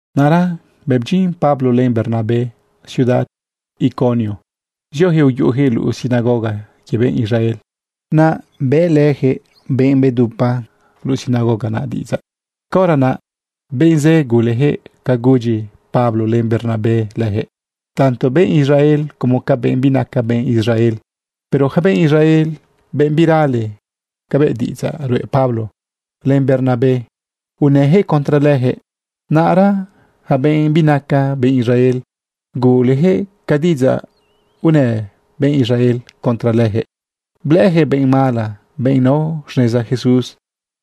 Naꞌra bëꞌ bdyin Pablo len Bernabé ciudad Iconio, zioyaquëꞌ uyuꞌuyaquëꞌ luꞌu sinagoga quie benꞌ Israel. Naꞌ bëꞌlëyaquëꞌ benꞌ bedupa luꞌu sinagoga naꞌ diꞌidzaꞌ. Caora naꞌ benꞌ zë guleyaquëꞌ ca gudyi Pablo len Bernabé leyaquëꞌ, tanto benꞌ Israel como ca benꞌ binaca benꞌ Israel. Pero yaca benꞌ Israel, benꞌ birale cabëꞌ diꞌidzaꞌ ruꞌe Pablo len Bernabé, unëyaquëꞌ contra leyaquëꞌ. Naꞌra ja benꞌ binaca benꞌ Israel, guleyaquëꞌ ca diꞌidzaꞌ unë benꞌ Israel contra lejëꞌ, blëꞌëyaquëꞌ benꞌ mala benꞌ nao xneza Jesús.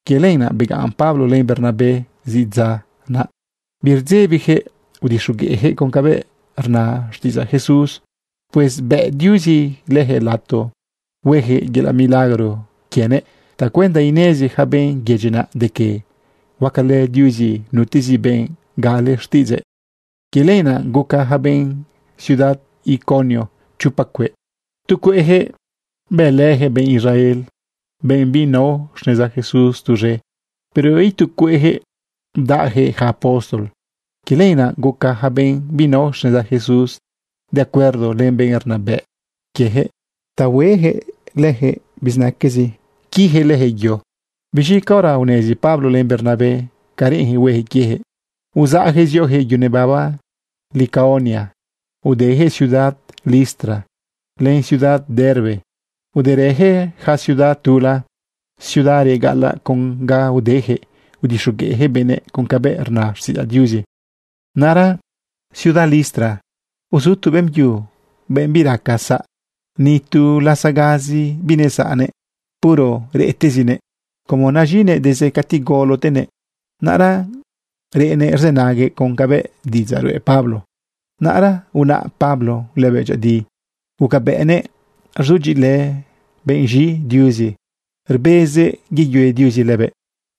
Quie lenaꞌ begaꞌn Pablo len Bernabé zidza naꞌ. Birdzebijëꞌ udixogueꞌyaquëꞌ con cabëꞌ rna xtiꞌidzaꞌ Jesús. Pues bëꞌ Diuzi leyaquëꞌ lato hueyaquëꞌ yelaꞌ milagro quienëꞌ tacuenda inezi yaca benꞌ yedyi naꞌ de que huacalë Diuzi nutezi benꞌ gale xtiꞌidzëꞌ. Quie lenaꞌ guca yaca benꞌ ciudad Iconio chopa cueꞌ. Tu cueꞌyaquëꞌ bëlëyaquëꞌ benꞌ Israel, benꞌ binao xneza Jesús tuz̃e. Pero itu cueꞌjëꞌ bdaꞌyaquëꞌ yaca apóstol. Quie lenaꞌ guca yaca benꞌ binao xneza Jesús de acuerdo len benꞌ rnabëꞌ quieyaquëꞌ ta hueyaquëꞌ leyaquëꞌ bizinaquezi quiyaquëꞌ leyaquëꞌ yo. Biz̃i caora unezi Pablo len Bernabé ca reꞌenyaquëꞌ hueyaquëꞌ quieyaquëꞌ, uzaꞌyaquëꞌ zioyaquëꞌ yu nebaba Licaonia, udeyaquëꞌ ciudad Listra len ciudad Derbe, uderëyaquëꞌ yaca ciudad tula, ciudad reꞌ gaꞌalaꞌ. Con ga udeyaquëꞌ, udixogueꞌjëꞌ benëꞌ con cabëꞌ rna xtiꞌidzaꞌ Diuzi. Naꞌra ciudad Listra uzu tu beꞌmbyu, benꞌ biraca saꞌ. Ni tu lasagazi binesaꞌnëꞌ. Puro reꞌtezinëꞌ como naz̃inëꞌ desde cati galotenëꞌ. Naꞌra reꞌnëꞌ rzënaguëꞌ con cabëꞌ diꞌidzaꞌ ruꞌe Pablo. Naꞌra unaꞌ Pablo lëbëꞌ dyëꞌëdi, gucabëꞌnëꞌ rzudyiꞌilë benꞌ z̃i Diuzi rbezëꞌ yeyue Diuzi lëbëꞌ.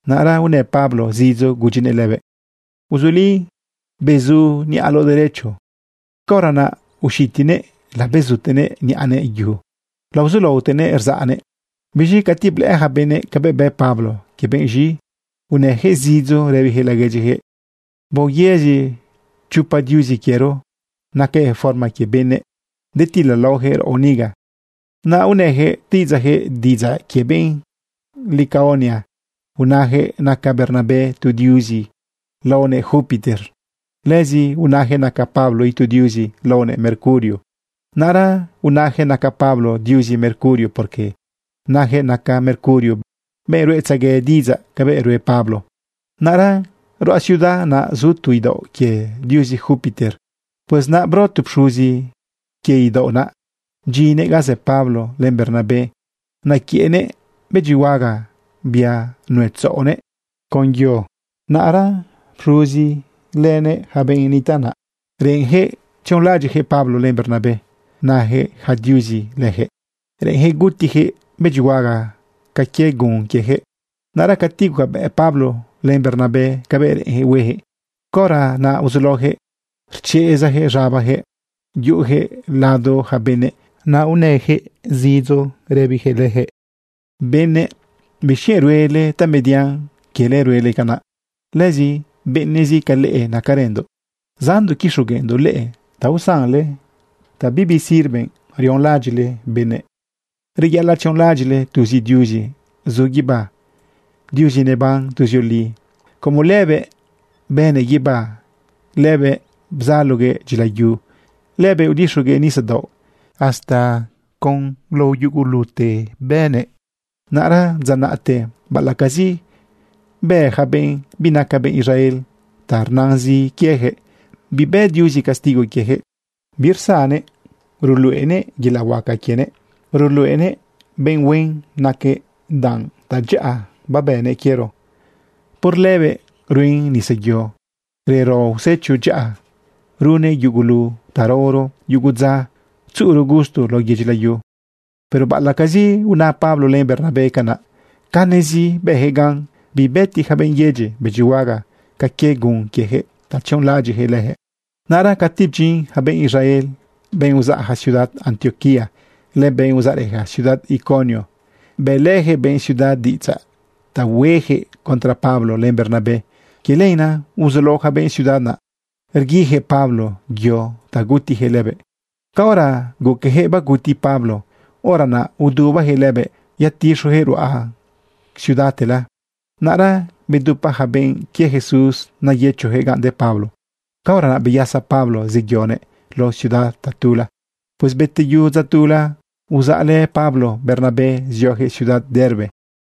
Naꞌra unë Pablo zidzo gudyinëꞌ lëbëꞌ: ―Uzuli, bezu niꞌaloꞌ derecho. Caora naꞌ uxitinëꞌ labezutenëꞌ niꞌanëꞌ yu, laozulaotenëꞌ rzaꞌnëꞌ. Biz̃i cati blëꞌë ja benëꞌ cabëꞌ bë Pablo quie benꞌ z̃i, unëyaquëꞌ zidzo rëbiyaquëꞌ laguedyiyaquëꞌ: ―¡Baoyëzi chopa diuzi quiero! ¡Nacajëꞌ forma quie benëꞌ detilalaoyaquëꞌ raꞌo niga! Naꞌ unëyaquëꞌ xtiꞌidzaꞌyaquëꞌ, diꞌidzaꞌ quie benꞌ Licaonia. Unayaquëꞌ naca Bernabé tu diuzi laonëꞌ Júpiter. Lëzi unayaquëꞌ naca Pablo itu diuzi laonëꞌ Mercurio. Naꞌra unayaquëꞌ naca Pablo diuzi Mercurio, porque nayaquëꞌ naca Mercurio benꞌ ruꞌetzegue diꞌidzaꞌ cabëꞌ ruꞌe Pablo. Naꞌra ruꞌa ciudad naꞌ zu tu idaoꞌ quie diuzi Júpiter. Pues naꞌ bro tu pxuzi quie idaoꞌ naꞌ, bdyinnëꞌ ga zë Pablo len Bernabé. Naquiëꞌnëꞌ bëdyihuaga, bia nuetzaꞌonëꞌ con yo. Naꞌra pxuzi lënëꞌ yaca benꞌ nitaꞌ naꞌ, reꞌenyaquëꞌ tzionlaꞌadyiꞌyaquëꞌ Pablo len Bernabé nayaquëꞌ yaca diuzi leyaquëꞌ. Reꞌenyaquëꞌ gutiyaquëꞌ bëdyihuaga ca quie gun quieyaquëꞌ. Naꞌra cati gucabëꞌ Pablo len Bernabé cabëꞌ reꞌenyaquëꞌ huejëꞌ, caora naꞌ uzulaoyaquëꞌ rchezayaquëꞌ z̃abayaquëꞌ, yuꞌuyaquëꞌ lado yaca benëꞌ naꞌ unëyaquëꞌ zidzo rëbiyaquëꞌ leyaquëꞌ: ―¡Benëꞌ! ¿Bixquienꞌ ruele tamedian quiele ruele canaꞌ? Lëzi benëꞌzi ca leꞌe nacarëndoꞌ zaꞌndoꞌ quixogueꞌndoꞌ leꞌe ta usanle ta bibi sirve rionlaꞌadyiꞌle benëꞌ. Reyaꞌalaꞌ tzionlaꞌadyiꞌle tuzi Diuzi zu guibá, Diuzi neban tuzioli. Como lëbëꞌ bënëꞌ guibá, lëbëꞌ bzaloguëꞌ dyila yu, lëbëꞌ udixuguëꞌ nisadaoꞌ. Hasta con lao yugulute bënëꞌ. Naꞌra dza naꞌte baꞌalaꞌcazi bë yaca benꞌ binaca benꞌ Israel ta rnazin quieyaquëꞌ, bibë Diuzi castigo quieyaquëꞌ. Birsannëꞌ ruluꞌenëꞌ yelaꞌ huaca quienëꞌ. Ruluꞌenëꞌ benꞌ huen naquëꞌ danꞌ tadyaꞌa babënnëꞌ quiero. Por lëbëꞌ ruen nisayo, rero usecho dyaꞌa, runnëꞌ yugulu ta raoro yugu dza tzuꞌuro gusto lao yedyi layu. Pero baꞌalaꞌcazi una Pablo len Bernabé canaꞌ, canezi bëyaquëꞌ gan bibëti yaca benꞌ yedyi bëdyihuaga ca quie gun quiejëꞌ ta tzionlaꞌadyiꞌjëꞌ leyaquëꞌ. Naꞌra cati bdyin yaca benꞌ Israel, benꞌ uzaꞌja ciudad Antioquía len benꞌ uzaꞌrëja ciudad Iconio, bëꞌlëyaquëꞌ benꞌ ciudad diꞌidzaꞌ ta huejëꞌ contra Pablo len Bernabé. Quie lenaꞌ uzulao ja benꞌ ciudad naꞌ rguijëꞌ Pablo yo ta gutiyaquëꞌ lëbëꞌ. Caora guqueyaquëꞌ baguti Pablo, hora naꞌ udubayaquëꞌ lëbëꞌ yatixojëꞌ ruꞌa ciudadtela. Naꞌra bedupa yaca benꞌ quie Jesús nayëchoyaquëꞌ ganꞌ de Pablo. Caora naꞌ beyasa Pablo zeyonëꞌ lao ciudad tatula. Pues beteyu dza tula, uzaꞌlë Pablo Bernabé zioyaquëꞌ ciudad Derbe.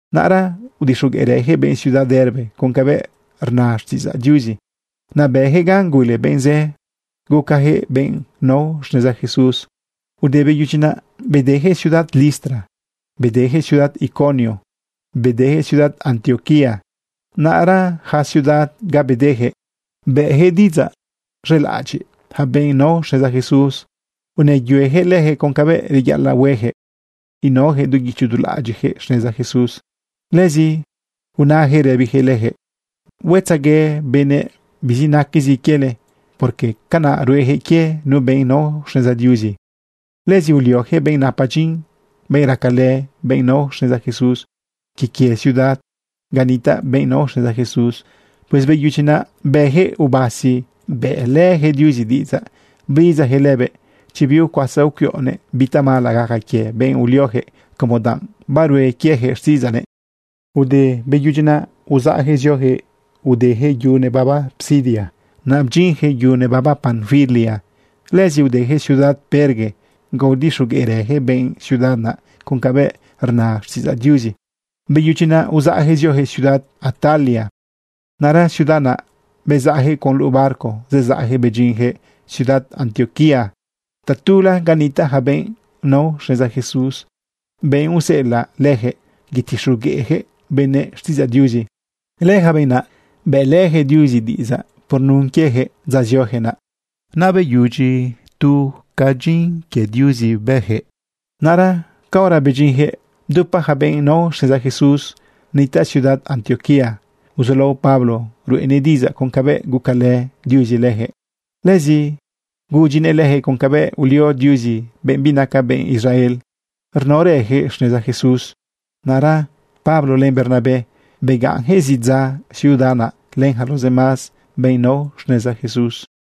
Naꞌra udixogueꞌrëjëꞌ benꞌ ciudad Derbe con cabëꞌ rna xtiꞌidzaꞌ Diuzi. Naꞌ bëyaquëꞌ gan gule benꞌ zë, gucayaquëꞌ benꞌ nao xneza Jesús. Ude beyudyi naꞌ, bedeyaquëꞌ ciudad Listra, bedeyaquëꞌ ciudad Iconio, bedeyaquëꞌ ciudad Antioquía. Naꞌra ja ciudad ga bedeyaquëꞌ, bëꞌyaquëꞌ diꞌidzaꞌ z̃elaꞌadyiꞌ yaca benꞌ nao xneza Jesús, unëyueyaquëꞌ leyaquëꞌ con cabëꞌ reyaꞌalaꞌ hueyaquëꞌ inaoyaquëꞌ du guicho du laꞌadyiꞌjëꞌ xneza Jesús. Lëzi unayaquëꞌ rëbiyaquëꞌ leyaquëꞌ: ―Huetzague benëꞌ bizinaquezi quiele, porque canaꞌ ruejëꞌ quie nu benꞌ nao xneza Diuzi. Lëzi ulioyaquëꞌ benꞌ napa dyin, benꞌ racalë benꞌ nao xneza Jesús quie quie ciudad ga nitaꞌ benꞌ nao xneza Jesús. Pues beyudyi naꞌ, bëyaquëꞌ ubasi bëꞌlëyaquëꞌ Diuzi diꞌidzaꞌ blidzayaquëꞌ lëbëꞌ chi biucuasa ucuiꞌonëꞌ bi tamala gaca quie benꞌ ulioyaquëꞌ como danꞌ barue quieyaquëꞌ xtiꞌidzaꞌnëꞌ. Ude beyudyi naꞌ, uzaꞌyaquëꞌ zioyaquëꞌ udeyaquëꞌ yu nebaba Pisidia, naꞌ bdyinyaquëꞌ yu nebaba Panfilia. Lëzi udejëꞌ ciudad Perge ga udixogueꞌrëjëꞌ benꞌ ciudad naꞌ con cabëꞌ rna xtiꞌidzaꞌ Diuzi. Beyudyi naꞌ uzaꞌyaquëꞌ zioyaquëꞌ ciudad Atalia. Naꞌra ciudad naꞌ bezaꞌyaquëꞌ con luꞌu barco zezaꞌyaquëꞌ bedyinyaquëꞌ ciudad Antioquía tatula ga nitaꞌ yaca benꞌ nao xneza Jesús, benꞌ useꞌelaꞌ leyaquëꞌ yetixogueꞌyaquëꞌ benëꞌ xtiꞌidzaꞌ Diuzi. Lëyaca benꞌ naꞌ bëꞌlëyaquëꞌ Diuzi diꞌidzaꞌ por nun quieyaquëꞌ dza zioyaquëꞌ naꞌ. Naꞌ beyudyi tu ca dyin quie Diuzi bëyaquëꞌ. Naꞌra caora bedyinyaquëꞌ, bdupa yaca benꞌ nao xneza Jesús nitaꞌ ciudad Antioquía. Uzulao Pablo ruꞌenëꞌ diꞌidzaꞌ con cabëꞌ gucalë Diuzi leyaquëꞌ. Lëzi gudyinëꞌ leyaquëꞌ con cabëꞌ ulio Diuzi benꞌ binaca benꞌ Israel rnaorëyaquëꞌ xneza Jesús. Naꞌra Pablo len Bernabé begaꞌnyaquëꞌ zidza ciudad naꞌ len yaca los demás benꞌ nao xneza Jesús.